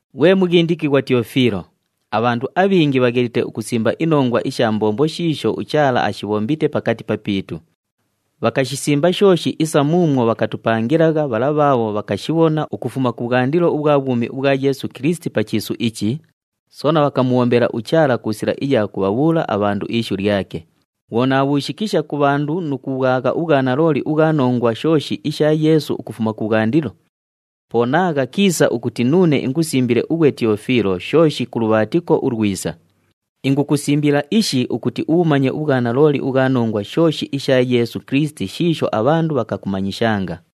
Ghwe mughindikighwa Tiyofiilo, abhandu abhingi bhaghelite ukusimba inongwa isha mbombo shiisho uChaala ashibhombite pakati papiitu. Bhakashisimba shooshi isa muumwo bhakatupangilagha bhala bhaabho bhakashibhona ukufuma kubhwandilo ubhwa bhwumi ubhwa Yeesu Kilisiti pa chiisu ichi, soona bhakamubhombela uChaala ku sila iya kubhabhuula abhandu ishu lyake. Bhwo naabhuushikisha ku bhandu nu kubhwagha ubhwanalooli ubhwa nongwa shooshi isha Yeesu ukufuma kubhwandilo, po naagha kiisa ukuti nuune ingusimbile ughwe Tiyofiilo shooshi ku lubhaatiko ulwisa. Ingukusimbila ishi ukuti ubhumanye ubhwanalooli ubhwa nongwa shooshi isha Yeesu Kilisiti shiisho abhandu bhakakumanyishanga.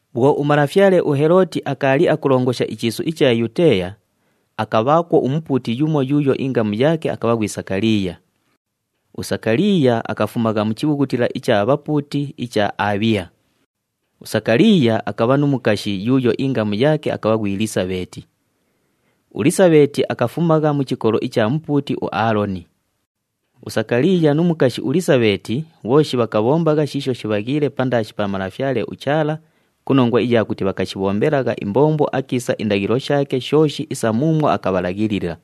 Bhwo umalafyale uHelooti akaali akulongosha ichiisu icha Yuteeya, akabhaakwo umupuuti yumo yuuyo ingamu yaake akabha ghwi Sakaliiya. USakaliiya akafumagha mu chibhughutila icha bhapuuti icha Abhiya. USakaliiya akabha nu mukashi yuuyo ingamu yaake akabha ghwi Lisabheeti. ULisabheeti akafumagha mu chikolo icha mupuuti uAaloni. USakaliiya nu mukashi uLisabheeti bhooshi bhakabhombagha shiisho shibhaghiile pandaashi pa Malafyale uChaala ku nongwa iya kuti bhakashibhombelagha imbombo akiisa indaghilo shaake shooshi isa muumwo akabhalaghilila.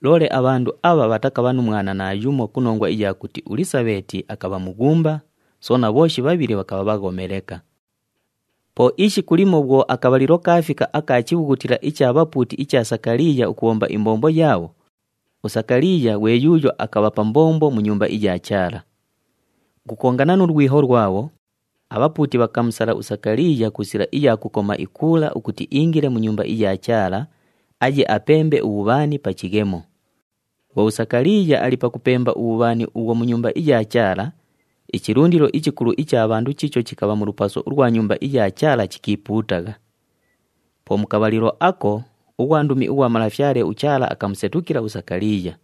Loole abhandu abha bhatakabha nu mwana naayumo ku nongwa iya kuti uLisabheeti akabha mughumba, soona bhooshi bhabhili bhakabha bhaghome leka. Po ishiku limo bhwo akabhalilo kaafika aka chibhughutila icha bhapuuti icha Sakaliiya ukubhomba imbombo yaabho, uSakaliiya ghwe yuuyo akabha pa mbombo mu Nyumba iya Chaala. Ukukongana nu lwiho lwabho, abhapuuti bhakamusala uSakaliiya ku sila iya kukoma ikuula ukuti iingile mu Nyumba iya Chaala, aye apembe ubhubhani pa chighemo. Bhwo uSakaliiya ali pakupemba ubhubhani ubhwo mu Nyumba iya Chaala, ichilundilo ichikulu icha bhandu chiicho chikabha mu lupaso ulwa Nyumba iya Chaala chikiipuutagha. Po mu kabhalilo ako, ughwandumi ughwa Malafyale uChaala akamusetukila uSakaliiya.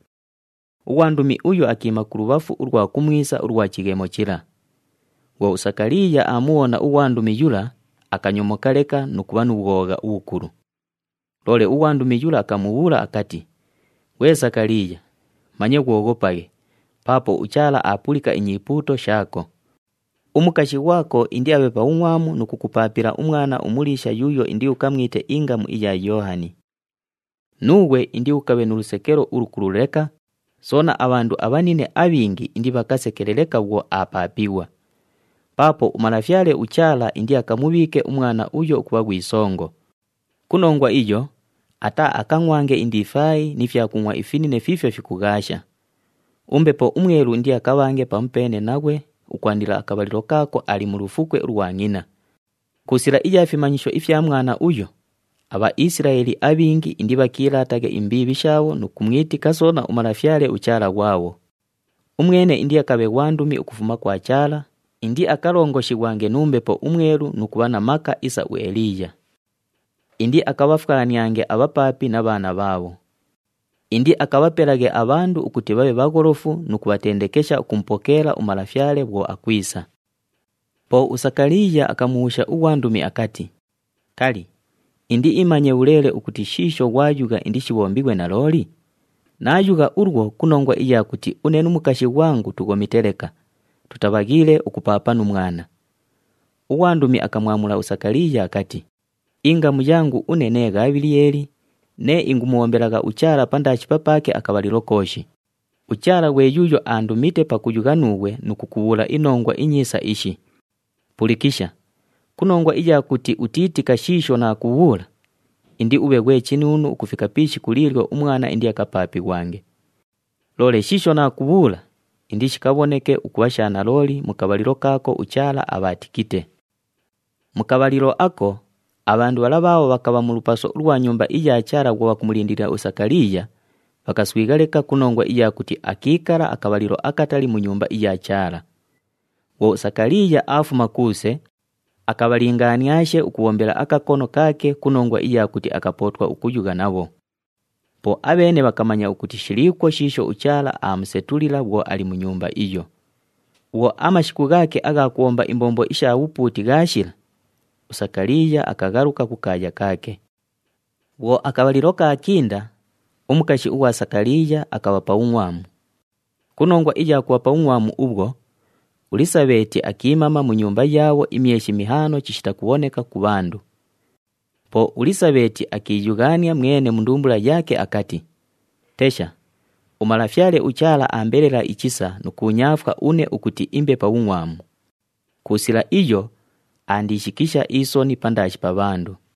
Ughwandumi uyo akiima kulubhafu ulwa kumwisa ulwa chighemo chila. Bhwo uSakaliiya aamubhona ughwandumi yula, akanyomoka leka nu kubha nu bhwogha ubhukulu. Loole ughwandumi yula akamubhuula akati, “Ghwe Sakaliiya, manye ghwoghopaghe, paapo uChaala aapulika inyipuuto shaako. Umukashi ghwako indiabhe pa bhungʼwamu nu kukupaapila umwana umuliisha yuuyo indiukamwite ingamu iya Yoohani. Nuughwe indiukabhe nu lusekelo ulukulu leka, soona abhandu abhanine abhingi indibhakasekele leka bhwo aapaapighwa. Paapo uMalafyale uChaala indiakamubhiike umwana uyo ukubha ghwi songo. Ku nongwa iyo, ataaakangʼwange indifaayi ni fyakungʼwa ifinine fiifyo fikughaasha. UMbepo uMwelu indiakabhange pamupeene naghwe ukwandila akabhalilo kaako ali mu lufukwe ulwa ngʼina. Ku sila iya fimanyisho ifya mwana uyo, aBhaisilaeli abhingi indibhakiilaataghe imbiibhi shaabho nu kumwitika soona uMalafyale uChaala ghwabho. Umwene indiakabhe ghwandumi ukufuma kwa Chaala, indiakalongoshighwange nu Mbepo uMwelu nu kubha na maka isa uEliiya. Indiakabhafwaniange abhapaapi na bhaana bhaabho. Indiakabhapelaghe abhandu ukuti bhabhe bhagholofu nu kubhatendekesha ukumupokeela uMalafyale bhwo akwisa.” Po uSakaliiya akamubhuusha ughwandumi akati, “Kali, indiimanye bhuleele ukuti shiisho ghwayugha indishibhombighwe nalooli? Naayugha ulwo ku nongwa iya kuti une nu mukashi ghwangu tughomite leka, tutabhaghiile ukupaapa nu mwana.” Ughwandumi akamwamula uSakaliiya akati, “Ingamu yangu une nee Ghabhiliyeeli, nee ingumubhombelagha uChaala pandaashi papaake akabhalilo kooshi. UChaala ghwe yuuyo aandumite pakuyugha nuughwe nu kukubhuula inongwa inyiisa ishi. Pulikisha, ku nongwa iya kuti utiitika shiisho naakubhuula, indiubhe ghwe chinuunu ukufika pi ishiku liilyo umwana indiakapaapighwange. Loole shiisho naakubhuula, indishikabhoneke ukubha sha nalooli mu kabhalilo kaako uChaala abhaatikite.” Mu kabhalilo ako, abhandu bhala bhaabho bhakabha mu lupaso ulwa Nyumba iya Chaala bhwo bhakumulindilila uSakaliiya, bhakaswigha leka ku nongwa iya kuti akiikala akabhalilo akatali mu Nyumba iya Chaala. Bhwo uSakaliiya aafuma kuuse, akabhalingaaniaashe ukubhombela akakono kaake ku nongwa iya kuti akapootwa ukuyugha nabho. Po abheene bhakamanya ukuti shiliikwo shiisho uChaala aamusetulila bhwo ali mu nyumba iyo. Bhwo amashiku ghaake agha kubhomba imbombo isha bhupuuti ghaashila, uSakaliiya akaghaluka kukaaya kaake. Bhwo akabhalilo kaakinda, umukashi ughwa Sakaliiya akabha pa bhungʼwamu. Ku nongwa iya kubha pa bhungʼwamu ubhwo, uLisabheeti akiimama mu nyumba yaabho imyeshi mihaano chishita kubhoneka ku bhandu. Po uLisabheeti akiiyughaania mwene mu ndumbula yaake akati, “Tesha! UMalafyale uChaala aambelela ichisa nu kuunyaafwa une ukuti imbe pa bhungʼwamu. Ku sila iyo, aandiishikisha isoni pandaashi pa bhandu.”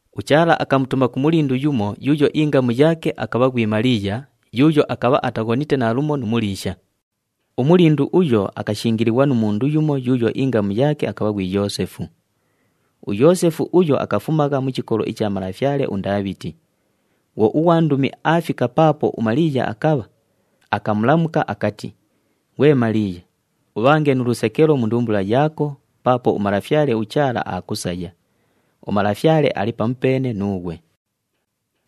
UChaala akamutuma ku mulindu yumo yuuyo ingamu yaake akabha ghwi Maliiya, yuuyo akabha ataghonite naalumo nu muliisha. Umulindu uyo akashingilighwa nu mundu yumo yuuyo ingamu yaake akabha ghwi Yoosefu. UYoosefu uyo akafumagha mu chikolo icha malafyale uNdaabhiti. Bhwo ughwandumi aafika paapo uMaliiya akabha, akamulamuka akati, “Ghwe Maliiya, ubhange nu lusekelo mu ndumbula yaako paapo uMalafyale uChaala aakusaya. UMalafyale ali pamupeene nuughwe.”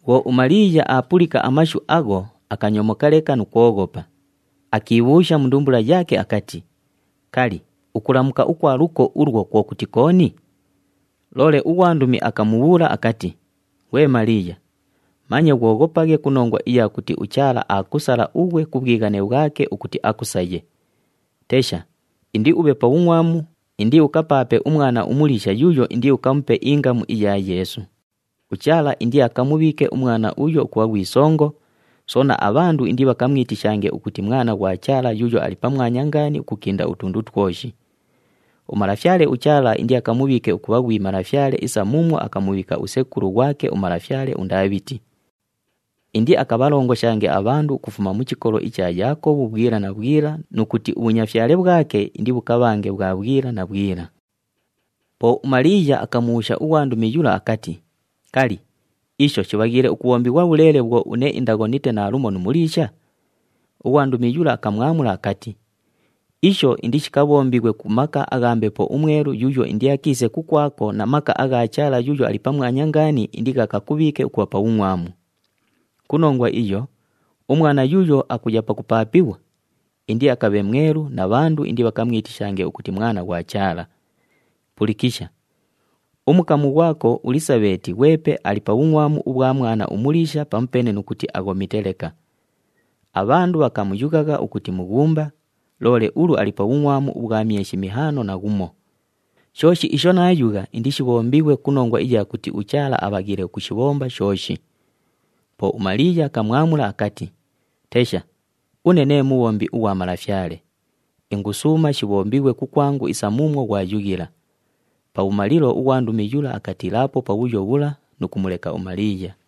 Bhwo uMaliiya aapulika amashu agho, akanyomoka leka nu kwoghopa, akiibhuusha mu ndumbula yaake akati, “Kali, ukulamuka ukwa luko ulwo kwo kuti kooni?” Loole ughwandumi akamubhuula akati, “Ghwe Maliiya, manye ghwoghopaghe ku nongwa iya kuti uChaala aakusala ughwe ku bhwighane bhwake ukuti akusaye. Tesha, indiubhe pa bhungʼwamu, indiukapaape umwana umuliisha yuuyo indiukamupe ingamu iya Yeesu. UChaala indiakamubhiike umwana uyo ukubha ghwi songo, soona abhandu indibhakamwitishange ukuti Mwana ghwa Chaala Yuuyo Ali Pamwanya Ngaani ukukinda utundu twoshi. UMalafyale uChaala indiakamubhiike ukubha ghwi malafyale isa muumwo akamubhiika usekulu ghwake umalafyale uNdaabhiti. Indiakabhalongoshange abhandu ukufuma mu chikolo icha Yaakobhu bhwila na bhwila nu kuti ubhunyafyale bhwake indibhukabhange bhwa bhwila na bhwila.” Po uMaliiya akamubhuusha ughwandumi yula akati, “Kali, isho shibhaghiile ukubhombighwa bhuleele bhwo une indaghonite naalumo nu muliisha?” Ughwandumi yula akamwamula akati, “Isho indishikabhombighwe ku maka agha Mbepo uMwelu yuuyo indiakiise kukwako na maka agha Chaala Yuuyo Ali Pamwanya Ngaani indighakakubhiike ukubha pa bhungʼwamu. Ku nongwa iyo, umwana yuuyo akuya pakupaapighwa, indiakabhe mwelu na bhandu indibhakamwitishange ukuti Mwana ghwa Chaala. Pulikisha! Umukamu ghwako uLisabheeti ghwepe ali pa bhungʼwamu ubhwa mwana umuliisha pamupeene nu kuti aghomite leka. Abhandu bhakamuyughagha ukuti mughumba, loole ulu ali pa bhungʼwamu ubhwa myeshi mihaano na ghumo! Shooshi isho naayugha indishibhombighwe ku nongwa iya kuti uChaala abhaghiile ukushibhomba shooshi.” Po uMaliiya akamwamula akati, “Tesha, une nee mubhombi ughwa Malafyale, ingusuuma shibhombighwe kukwangu isa muumwo ghwayughila.” Pabhumalilo ughwandumi yula akatiilaapo pabhuyo bhula nu kumuleka uMaliiya.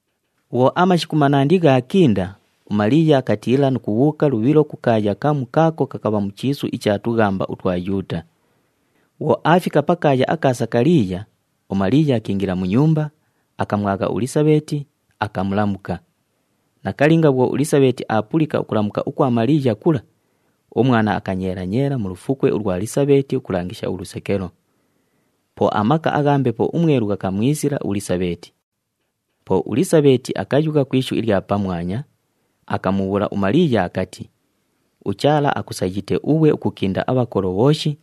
Bhwo amashiku manandi ghaakinda, uMaliiya akatiila nu kubhuuka lubhilo ku kaaya kamu kaako kakabha mu chiisu icha tughamba utwa Yuuta. Bhwo aafika pakaaya aka Sakaliiya, uMaliiya akiingila mu nyumba, akamwagha uLisabheeti, akamulamuka. Nakalinga bhwo uLisabheeti aapulika ukulamuka ukwa Maliiya kula, umwana akanyeela-nyeela mu lufukwe ulwa Lisabheeti ukulangisha ulusekelo. Po amaka agha Mbepo uMwelu ghakamwisila uLisabheeti. Po uLisabheeti akayugha ku ishu ilya pamwanya, akamubhuula uMaliiya akati, “UChaala akusayite ughwe ukukinda abhakolo bhooshi,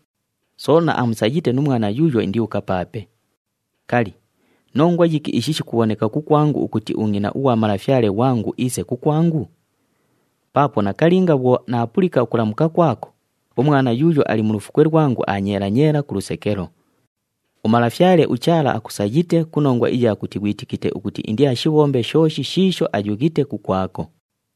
soona amusayite nu mwana yuuyo indiukapaape. Kali, nongwa yiki ishi shikubhoneka kukwangu ukuti ungʼina ughwa Malafyale ghwangu iise kukwangu? Paapo nakalinga bhwo naapulika ukulamuka kwako, umwana yuuyo ali mu lufukwe lwangu aanyeela-nyeela ku lusekelo. UMalafyale uChaala akusayite ku nongwa iya kuti ghwitikite ukuti indiashibhombe shooshi shiisho ayughite kukwako.”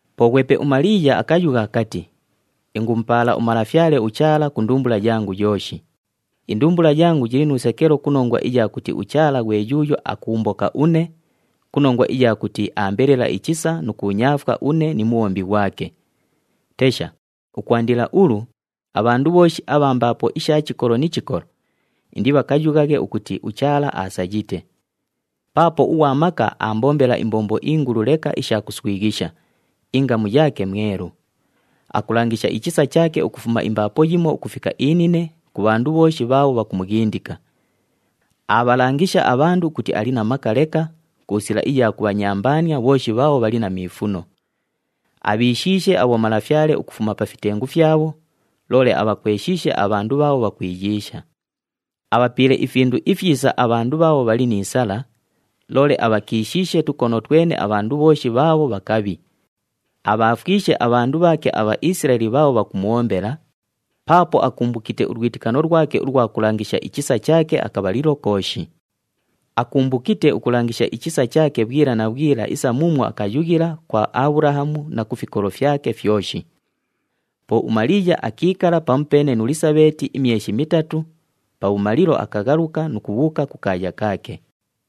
Po ghwepe uMaliiya akayugha akati, “Ingumupaala uMalafyale uChaala ku ndumbula yangu yooshi. Indumbula yangu yili nu lusekelo ku nongwa iya kuti uChaala ghwe yuuyo akuumboka une, ku nongwa iya kuti aambelela ichisa nu kuunyaafwa une ni mubhombi ghwake. Tesha, ukwandila ulu, abhandu bhooshi abha mbaapo isha chikolo ni chikolo indibhakayughaghe ukuti uChaala aasayite. Paapo uGhwa Maka aambombela imbombo ingulu leka isha kuswighisha, ingamu yaake mwelu. Akulangisha ichisa chaake ukufuma imbaapo yimo ukufika inine ku bhandu bhooshi bhaabho bhakumughindika. Aabhalangisha abhandu ukuti ali na maka leka, ku sila iya kubhanyambaania bhooshi bhaabho bhali na miifuno. Abhiishiishe abhomalafyale ukufuma pa fitengu fyabho, loole abhakweshiishe abhandu bhaabho bhakwiyiisha. Abhapiile ifindu ifyisa abhandu bhaabho bhali ni sala, loole abhakishiishe tukono twene abhandu bhooshi bhaabho bhakabhi. Abhaafwishe abhandu bhaake aBhaisilaeli bhaabho bhakumubhombela, paapo akumbukite ulwitikano lwake ulwa kulangisha ichisa chaake akabhalilo kooshi. Akumbukite ukulangisha ichisa chaake bhwila na bhwila isa muumwo akayughila kwa Abhulahamu na ku fikolo fyake fyoshi.” Po uMaliiya akiikala pamupeene nu Lisabheeti imyeshi mitatu, pabhumalilo akaghaluka nu kubhuuka kukaaya kaake.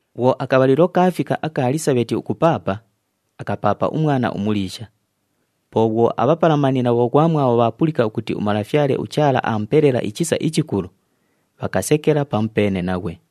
Bhwo akabhalilo kaafika aka Lisabheeti ukupaapa, akapaapa umwana umuliisha. Po bhwo abhapalamani na bhoghwamwabho bhaapulika ukuti uMalafyale uChaala aamupelela ichisa ichikulu, bhakasekela pamupeene naghwe.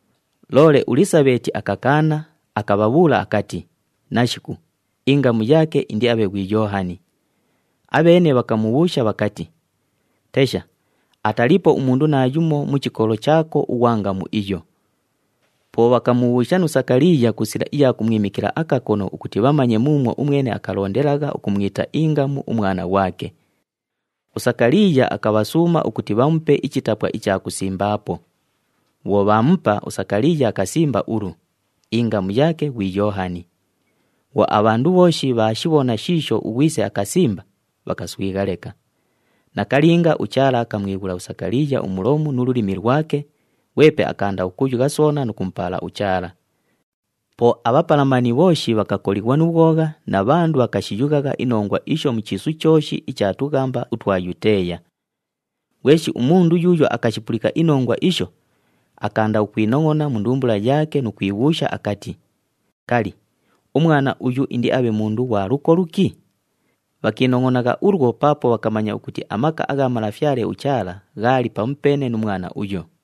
Loole uLisabheeti akakaana, akabhabhuula akati, “Nashiku, ingamu yaake indiabhe ghwi Yoohani.” Abheene bhakamubhuusha bhakati, “Tesha, ataliipo umundu naayumo mu chikolo chaako ughwa ngamu iyo!” Po bhakamubhuusha nu Sakaliiya ku sila iya kumwimikila akakono ukuti bhamanye muumwo umwene akalondelagha ukumwita ingamu umwana ghwake. USakaliiya akabhasuuma ukuti bhamupe ichitapwa icha kusimbaapo. Bhwo bhaamupa, uSakaliiya akasimba ulu, “Ingamu yaake ghwi Yoohani.” Bhwo abhandu bhooshi bhaashibhona shiisho ughwise akasimba, bhakaswigha leka. Nakalinga, uChaala akamwighula uSakaliiya umulomu nu lulimi lwake, ghwepe akaanda ukuyugha soona nu kumupaala uChaala. Po abhapalamani bhooshi bhakakolighwa nu bhwogha na bhandu bhakashiyughagha inongwa isho mu chiisu chooshi icha tughamba utwa Yuteeya. Ghweshi umundu yuuyo akashipulika inongwa isho, akaanda ukwinongʼona mu ndumbula yaake nu kwibhuusha akati, “Kali, umwana uyu indiabhe mundu ghwa luko luki?” Bhakiinongʼonagha ulwo paapo bhakamanya ukuti amaka agha Malafyale uChaala ghaali pamupeene nu mwana uyo.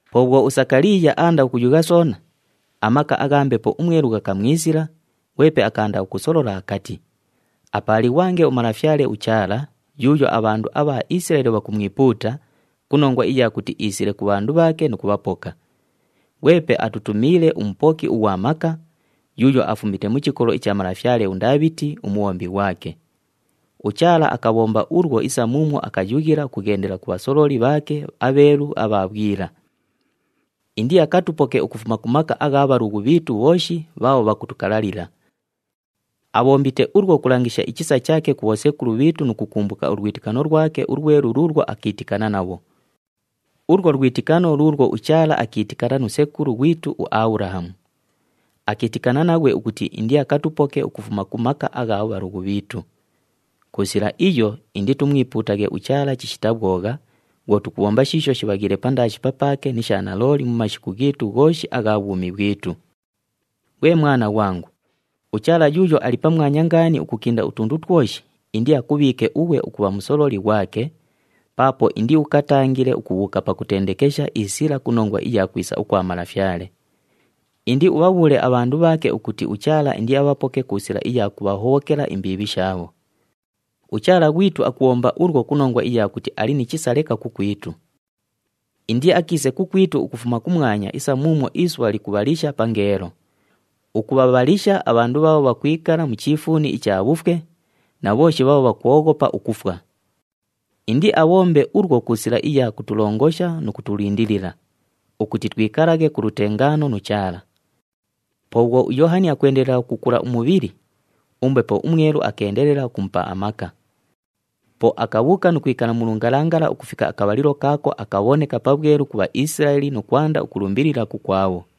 Po bhwo uSakaliiya aanda ukuyugha soona, amaka agha Mbepo uMwelu ghakamwisila, ghwepe akaanda ukusolola akati, “Apaalighwange uMalafyale uChaala, yuuyo abhandu abha Isilaeli bhakumwipuuta, ku nongwa iya kuti iisile ku bhandu bhaake nu kubhapoka. Ghwepe atutumiile uMupoki ughwa Maka, yuuyo afumite mu chikolo icha malafyale uNdaabhiti, umubhombi ghwake. UChaala akabhomba ulwo isa muumwo akayughila ukughendelela ku bhasololi bhaake abheelu abha bhwila. Indiakatupoke ukufuma ku maka agha bhalughu bhiitu bhooshi bhaabho bhakutukalalila. Abhombite ulwo ukulangisha ichisa chaake ku bhosekulu bhiitu nu kukumbuka ulwitikano lwake ulwelu luulwo akiitikana nabho. Ulwo lwitikano luulwo uChaala akiitikana nu sekulu ghwitu uAbhulahamu. Akiitikana naghwe ukuti indiakatupoke ukufuma ku maka agha bhalughu bhiitu. Ku sila iyo, inditumwipuutaghe uChaala chishita bhwogha bhwo tukubhomba shiisho shibhaghiile pandaashi papaake ni sha nalooli mu mashiku ghiitu ghooshi agha bhwumi bhwitu. Ghwe mwana ghwangu, uChaala Yuuyo Ali Pamwanya Ngaani ukukinda utundu twoshi indiakubhiike ughwe ukubha musololi ghwake, paapo indiukatangile ukubhuuka pakutendekesha isila ku nongwa iya kwisa ukwa Malafyale. Indiubhabhuule abhandu bhaake ukuti uChaala indiabhapoke ku sila iya kubhahobhokela imbiibhi shaabho. UChaala ghwitu akubhomba ulwo ku nongwa iya kuti ali ni chisa leka kukwitu. Indiakiise kukwitu ukufuma kumwanya isa muumwo isubha likubhalisha pangeelo, ukubhabhalisha abhandu bhaabho bhakwikala mu chiifuuni icha bhufwe, na bhooshi bhaabho bhakwoghopa ukufwa. Indiabhombe ulwo ku sila iya kutulongosha nu kutulindilila, ukuti twikalaghe ku lutengaano nu Chaala.” Po bhwo uYoohani akwendelela ukukula umubhili, uMbepo uMwelu akeendelela ukumupa amaka. Po akabhuuka nu kwikala mu lungalangala ukufika akabhalilo kaako akabhoneka pabhwelu ku Bhaisilaeli nu kwanda ukulumbilila kukwabho.